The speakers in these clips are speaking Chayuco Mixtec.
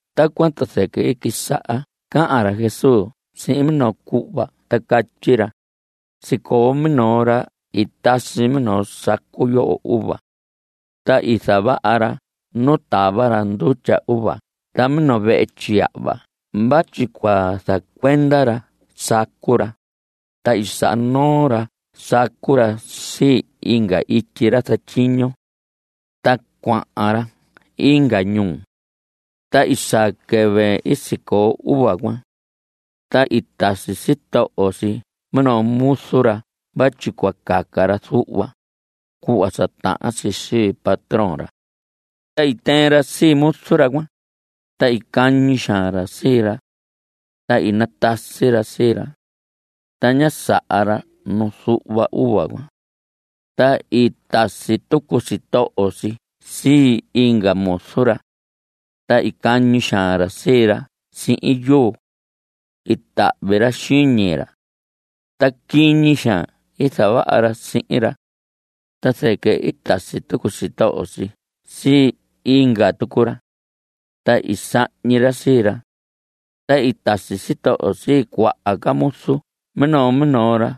Tacuan ta zɨquɨ i quisaha cahan ra Jesús sihin minoo cuhva ta catyi ra: Sicoo minoo ra i tasi minoo sacu yoho uva. Ta i zavaha ra nu i tava ra ndutya uva ta minoo vehe tyiyahva vatyi cua zacuenda ra sacu ra, ta i saha noo ra sacu ra sii inga ityi ra zatyiño. Ta cuahan ra inga ñuu. Ta i saa quɨvɨ i sicoo uva cuan. Ta i tasi sitoho si minoo muzu ra vatyi cua caca ra zuhva, cuhva sa tahan si sii patrón ra. Ta i tɨɨn ra sii muzu ra cuan, ta i cañi xaan ra sii ra. Ta i natasi ra sii ra. Ta ñá saha ra nu zuhva uva cuan. Ta i tasi tucu sitoho si sii inga muzu ra. Ta i cañi xaan ra sii ra sihin yuu. I tahvi ra xiñi ra. Ta quiñi xaan i zavaha ra sihin ra. Ta zɨquɨ i tasi tucu sitoho si sii inga tucu ra. Ta i sahñi ra sii ra. Ta i tasi sitoho si cuaha ca muzu minoo minoo ra.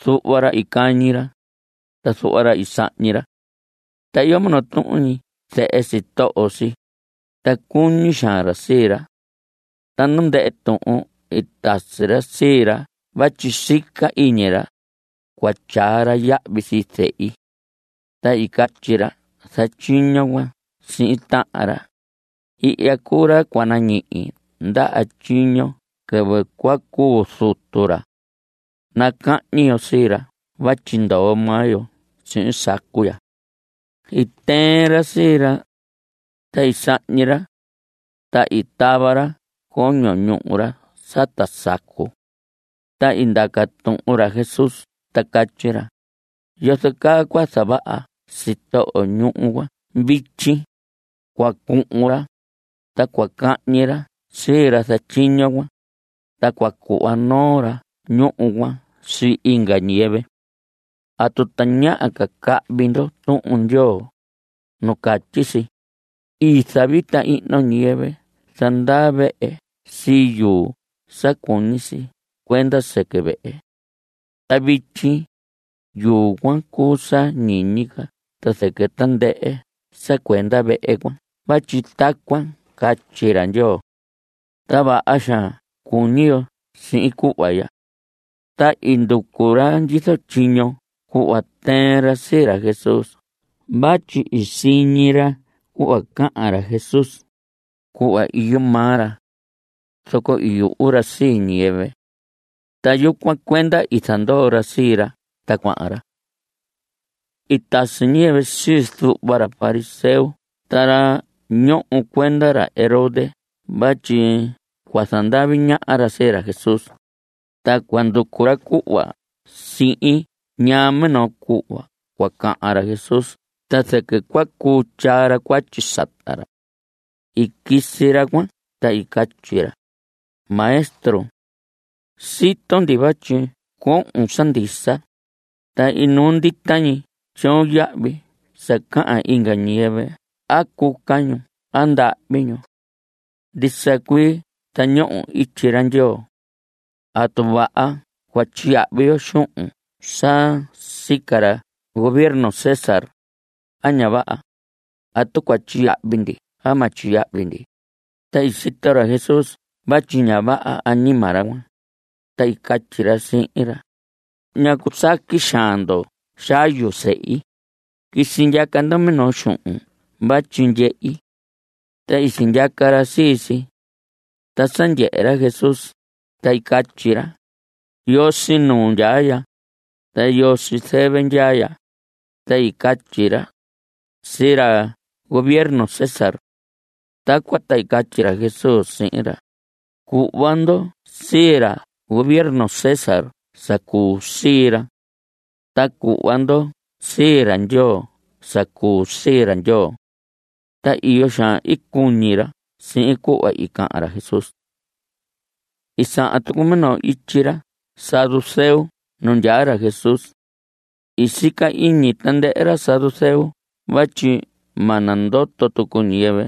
Zuhva ra i cañi ra, ta zuhva ra i sahñi ra. Ta iyo minoo tuhun ñi zehe sitoho si, ta cuñi xaan ra sii ra. Ta nu ndɨhɨ tuhun i tasi ra sii ra vatyi sica iñi ra: “Cua tyaa ra yahvi sii zehi.” Ta i catyi ra zatyiño cuan sihin tahan ra: “Ihya cuu ra cua nañihi ndaha tyiño quɨvɨ cua cuu zutu ra. Nacahñi yo sii ra vatyi ndoo maa yo sihin sacu ya.” I tɨɨn ra sii ra. Ta i sahñi ra. Ta i tava ra coño ñuhu ra sata sacu. Ta i ndaca tuhun ra Jesús ta catyi ra: ¿Yozo caa cua zavaha sitoho ñuhu cuan vityi? Cua cuhun ra, ta cua cahñi ra sii ra zatyiño cuan. Ta cua cuhva noo ra ñuhu cuan sii inga ñiyɨvɨ. ¿Atu tañaha ca cahvi ndo Tuhun Ndyoo? nu catyi si: I zavita ihno ñiyɨvɨ zandaa vehe sii yuu sa cuñi si cuenda sɨquɨ vehe. Ta vityi, yuu cuan cuu sa ñiñi ca ta zɨquɨ tandɨhɨ sa cuenda vehe cuan vatyi tacuan catyi ra Ndyoo. Ta vaha xaan cuñi yo sihin cuhva ya. Ta i nducu ra ndyizo tyiño cuhva tɨɨn ra sii ra Jesús vatyi i siñi ra cuhva cahan ra Jesús, cuhva iyo maa ra. Zoco i yuhu ra sii ñiyɨvɨ. Ta yucuan cuenda i zandoo ra sii ra ta cuahan ra. I tasi ñiyɨvɨ sii zuhva ra fariseo ta ra ñoho cuenda ra Herodes vatyi cua zandavi ñaha ra sii ra Jesús, ta cua nducu ra cuhva sihin ñaa minoo cuhva cua cahan ra Jesús ta zɨquɨ cua cuu tyaa ra cuatyi sata ra. I quisi ra cuan ta i catyi ra: Maestro, sito ndi vatyi cohon sa ndisa, ta inuu ndita ñi tyoon yahvi sa cahan inga ñiyɨvɨ a cuca ñu a ndahvi ñu. Ndisa cuii zañohon ityi ra Ndyoo. ¿Atu vaha cua tyiyahvi yo xuhun sa sica ra gobierno César, a ña vaha? ¿Atu cua tyiyahvi ndi a ma tyiyahvi ndi? Ta i sito ra Jesús vatyi ña vaha añima ra cuan, ta i catyi ra sihin ra: ¿Ñacu saqui xaan ndo xayu sehi? Quisi ndyaca ndo minoo xuhun vatyi ndyehi. Ta i sindyaca ra sii si. Ta sa ndyehe ra Jesús, ta i catyi ra: ¿Yoo sii nuu ndyaa ya? ¿Ta yoo sii zɨvɨ ndyaa ya? Ta i catyi ra: Sii ra gobierno César. Tacuan ta i catyi ra Jesús sihin ra: Cuhva ndo sii ra gobierno César sa cuu sii ra. Ta cuhva ndo sii ra Ndyoo sa cuu sii ra Ndyoo. Ta iyo xaan i cuñi ra sihin cuhva i cahan ra Jesús. I sahan tucu minoo ityi ra saduceo nu ndyaa ra Jesús. I sica iñi tandɨhɨ ra saduceo vatyi ma nandoto tucu ñiyɨvɨ,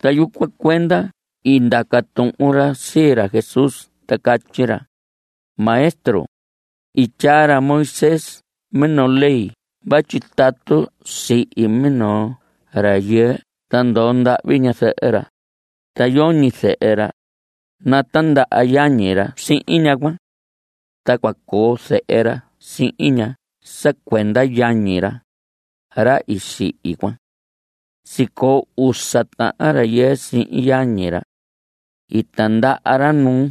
ta yucuan cuenda i ndaca tuhun ra sii ra Jesús ta catyi ra: Maestro, i tyaa ra Moisés minoo ley vatyi tatu sihi minoo rayɨɨ ta ndoo ndahvi ñazɨhɨ ra, ta yoñi zehe ra, natindaha yañi ra sihin ñaha cuan. Ta cua coo zehe ra sihin ña sa cuenda yañi ra, ra i sihi cuan. Sicoo usa tahan rayɨɨ sihin yañi ra. I tindaha ra nuu,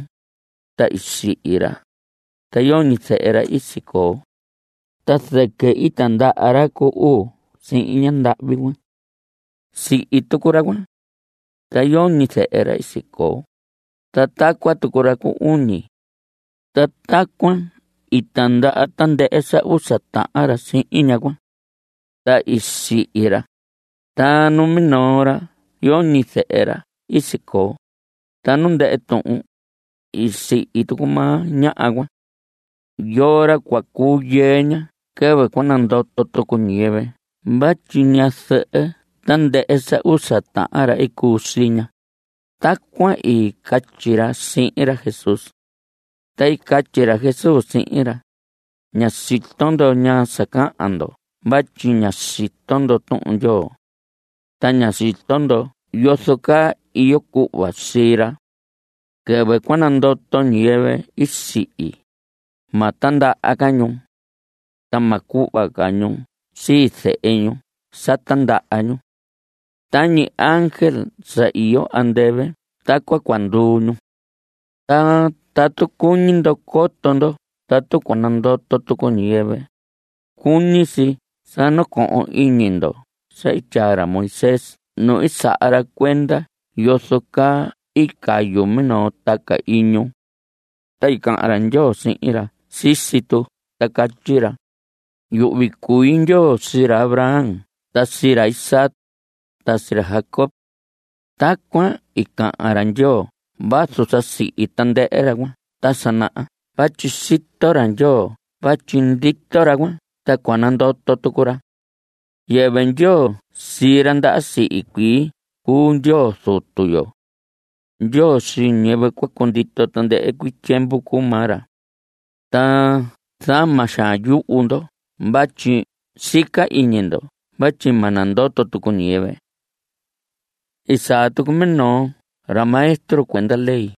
ta i sihi ra, ta yoñi zehe ra i sicoo. Ta zɨquɨ i tindaha ra cu uu sihin ñandahvi cuan. Sihi tucu ra cuan. Ta yoñi zehe ra i sicoo. Ta tacuan tucu ra cu uñi. Ta tacuan i tindaha tandɨhɨ sa usa tahan ra sihin ñaha cuan. Ta i sihi ra. Ta numinoo ra yoñi zehe ra i sicoo. Ta nu ndɨhɨ tuhun, i sihi tucu maa ñaha cuan. ¿Yoo ra cua cuu yɨɨ ña quɨvɨ cua nandoto tucu ñiyɨvɨ vatyi ñazɨhɨ tandɨhɨ sa usa tahan ra i cuu sii ña? Tacuan i catyi ra sihin ra Jesús. Ta i catyi ra Jesús sihin ra: Ña sito ndo ñaa sa cahan ndo vatyi ña sito ndo Tuhun ra Ndyoo. Ta ña sito ndo yozo caa iyo cuhva sii ra. Quɨvɨ cua nandoto ñiyɨvɨ i sihi, ma tindaha ca ñu. Ta ma cuhva ca ñu sii zehe ñu sa tindaha ñu. Tañi ángel sa iyo andɨvɨ tacuan cua nduu ñu. Ta tatu cuñi ndo coto ndo tatu cua nandoto tucu ñiyɨvɨ, cuñi si sa nacohon iñi ndo sa i tyaa ra Moisés nu i saha ra cuenda yozo caa i cayu minoo taca iñu. Ta i cahan ra Ndyoo sihin ra sisi tu ta catyi ra: “Yuhvi cui Ndyoo sii ra Abraham ta sii ra Isaac, ta sii ra Jacob.” Tacuan i cahan ra Ndyoo vazu sa sihi tandɨhɨ ra cuan ta sa naha vatyi sito ra Ndyoo vatyi ndito ra cuan ta cua nandoto tucu ra. Yɨvɨ Ndyoo sii ra ndaha sihi cuii cuu Ndyoo Zutu yo. Ndyoo sii ñiyɨvɨ cua cundito tandɨhɨ tyiemvu cuu maa ra. Ta zama xaan yuhu ndo vatyi sica iñi ndo vatyi ma nandoto tucu ñiyɨvɨ. I saa tucu minoo ra maestro cuenda ley,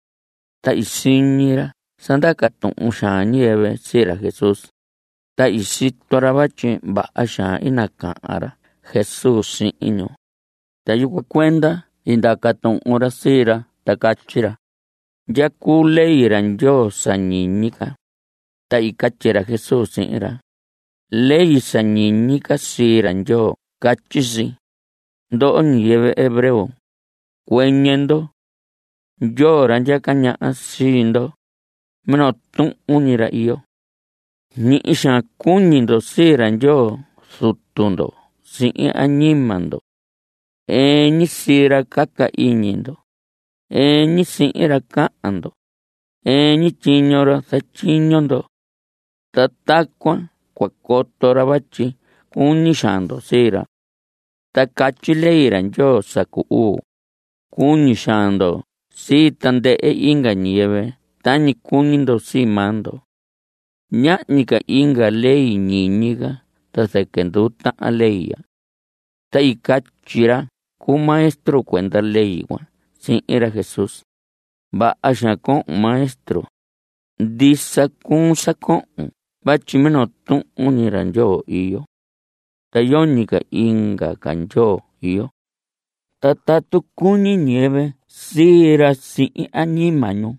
ta i siñi ra sa ndaca tuhun xaan ñiyɨvɨ sii ra Jesús, ta i sito ra vatyi vaha xaan i nacahan ra Jesús sihin ñu, ta yucuan cuenda i ndaca tuhun ra sii ra ta catyi ra: ¿Ndya cuu ley ra Ndyoo sa ñiñi ca? Ta i catyi ra Jesús sihin ra: Ley sa ñiñi ca sii ra Ndyoo catyi si: “Ndoho ñiyɨvɨ hebreo, cuɨñɨ ndo. Ndyoo, ra ndyaca ñaha sii ndo, minoo tuhun ñi ra iyo. Ñihi xaan cuñi ndo sii ra Ndyoo Zutu ndo sihin añima ndo. Ɨɨn ñi sii ra caca iñi ndo; ɨɨn ñi sihin ra cahan ndo; ɨɨn ñi tyiño ra zatyiño ndo. Ta tacuan cua coto ra vatyi cuñi xaan ndo sii ra.” Ta catyi ley ra Ndyoo sa cu uu: “Cuñi xaan ndo sii tandɨhɨ inga ñiyɨvɨ tañi cuñi ndo sii maa ndo.” Ñahñi ca inga ca ley ñiñi ca ta zɨquɨ nduu tahan ley ya. Ta i catyi ra cu maestro cuenda ley cuan sihin ra Jesús: Vaha xaan cohon, Maestro. Ndisa cuun sa cohon vatyi minoo tuhun ñi ra Ndyoo iyo. Ta yoñi inga ca Ndyoo iyo. Ta tatu cuñi ñiyɨvɨ sii ra sihin añima ñu,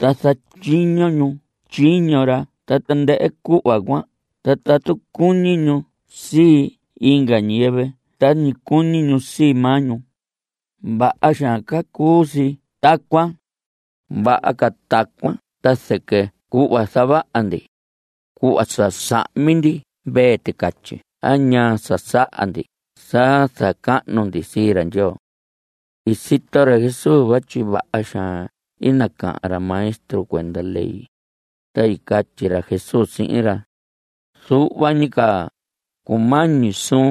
ta zatyiño ñu tyiño ra ta tandɨhɨ cuhva cuan ta tatu cuñi ñu sii inga ñiyɨvɨ tañi cuñi ñu sii maa ñu, vaha xaan ca cuu si tacuan. Vaha ca tacuan ta zɨquɨ cuhva zavaha ndi, cuhva sa sahmi ndi mvee ticatyi a ñaa sa saha ndi sa zacahnu ndi sii ra Ndyoo. I sito ra Jesús vatyi vaha xaan i nacahan ra maestro cuenda ley, ta i catyi ra Jesús sihin ra: Zuhva ñi ca cumañi suun,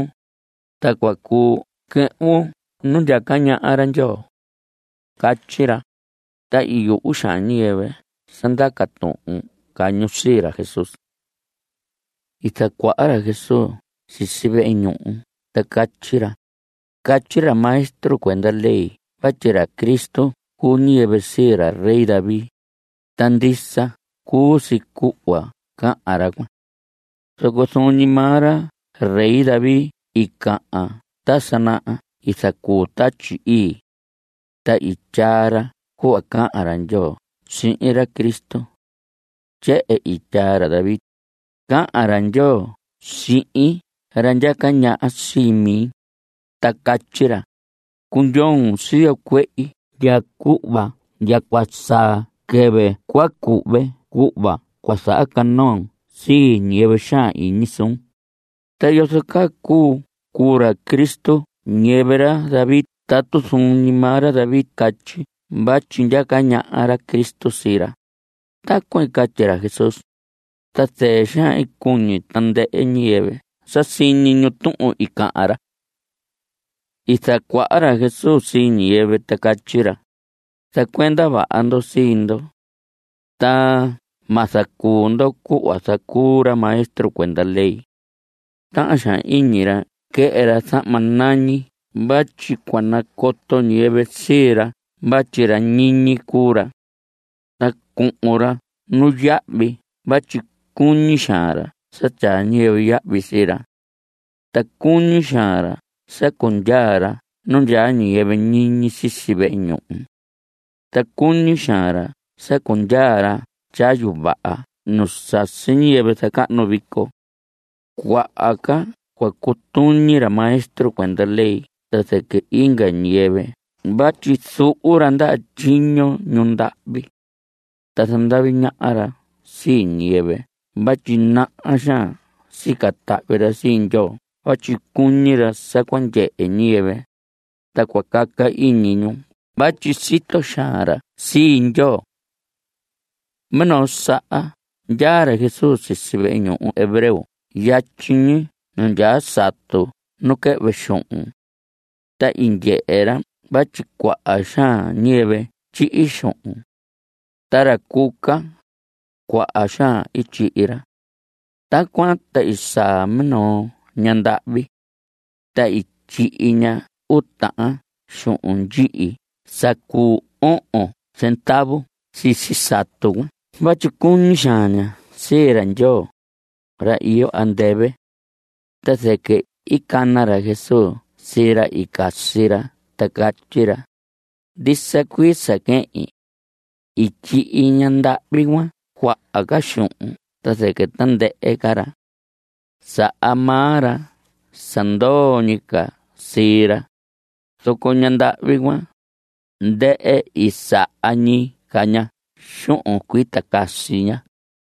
ta cua cuu quɨhvun nu ndyaca ñaha ra Ndyoo. Catyi ra. Ta i yuhu xaan ñiyɨvɨ sa ndaca tuhun ca ñu sii ra Jesús. I zacuaha ra Jesús sisi vehe ñuhu ta catyi ra: Catyi ra maestro cuenda ley vatyi ra Cristo cuu ñiyɨvɨ sii ra rey David, ta ndisa cuu si cuhva cahan ra cuan. Zoco zuun ñi maa ra rey David i cahan ta sa naha i zacuu Tatyi Ii. Ta i tyaa ra cuhva cahan ra Ndyoo sihin ra Cristo. Tyehen i tyaa ra David: Cahan ra Ndyoo sihin ra ndyaca ñaha sii mi, ta catyi ra: “Cundyoon siyo cuehi ndya cuhva ndya cua saa quɨvɨ cua cuhve cuhva cua zahacanoon sii ñiyɨvɨ xaan iñi suun.” ¿Ta yozo caa cuu cuu ra Cristo ñiyɨvɨ ra David tatu zuun ñi maa ra David catyi vatyi ndyaca ñaha ra Cristo sii ra? Tacuan i catyi ra Jesús, ta zɨɨ xaan i cuñi tandɨhɨ ñiyɨvɨ sa siñi ñu tuhun i cahan ra. I zacuaha ra Jesús sii ñiyɨvɨ ta catyi ra: Zacuenda vaha ndo sii ndo. Ta ma zacuu ndo cuhva zacuu ra maestro cuenda ley. Tahan xaan iñi ra quɨhɨ ra zahma nañi vatyi cua nacoto ñiyɨvɨ sii ra vatyi ra ñiñi cuu ra. Ta cuhun ra nuyahvi vatyi cuñi xaan ra sa tyaa ñiyɨvɨ yahvi sii ra. Ta cuñi xaan ra sa cundyaa ra nu ndyaa ñiyɨvɨ ñiñi sisi vehe ñuhu. Ta cuñi xaan ra sa cundyaa ra tyayu vaha nu sasi ñiyɨvɨ zacahnu vico. Cuaha ca cua cutuñi ra maestro cuenda ley ta zɨquɨ inga ñiyɨvɨ vatyi zuhu ra ndaha tyiño ñu ndahvi. Ta zandavi ñaha ra sii ñiyɨvɨ vatyi naha xaan sica tahvi ra sii Ndyoo vatyi cuñi ra sa cua ndyehe ñiyɨvɨ, ta cua caca iñi ñu vatyi sito xaan ra sii Ndyoo. Minoo saha ndyaa ra Jesús sisi vehe ñuhu hebreo yatyi ñi nu ndyaa satu nu quɨhvɨ xuhun. Ta i ndyehe ra vatyi cuaha xaan ñiyɨvɨ tyihi xuhun. Ta ra cuca, cuaha xaan i tyihi ra. Tacuan ta i saa minoo ñaha ndahvi. Ta i tyihi ña uu tahan xuhun ndyihi sa cuu ohon zendavu sisi satu cuan vatyi cuñi xaan ña sii ra Ndyoo, ra iyo andɨvɨ. Ta zɨquɨ i cana ra Jesús sii ra i casi ra ta catyi ra: Ndisa cuii sa quehin. I tyihi ñandahvi cuan cuaha ca xuhun ta zɨquɨ tandɨhɨ ca ra. Saha maa ra sa ndoo ñi ca sii ra, zoco ñandahvi cuan, ndɨhɨ i saha ñi ca ña xuhun cuita casi ña.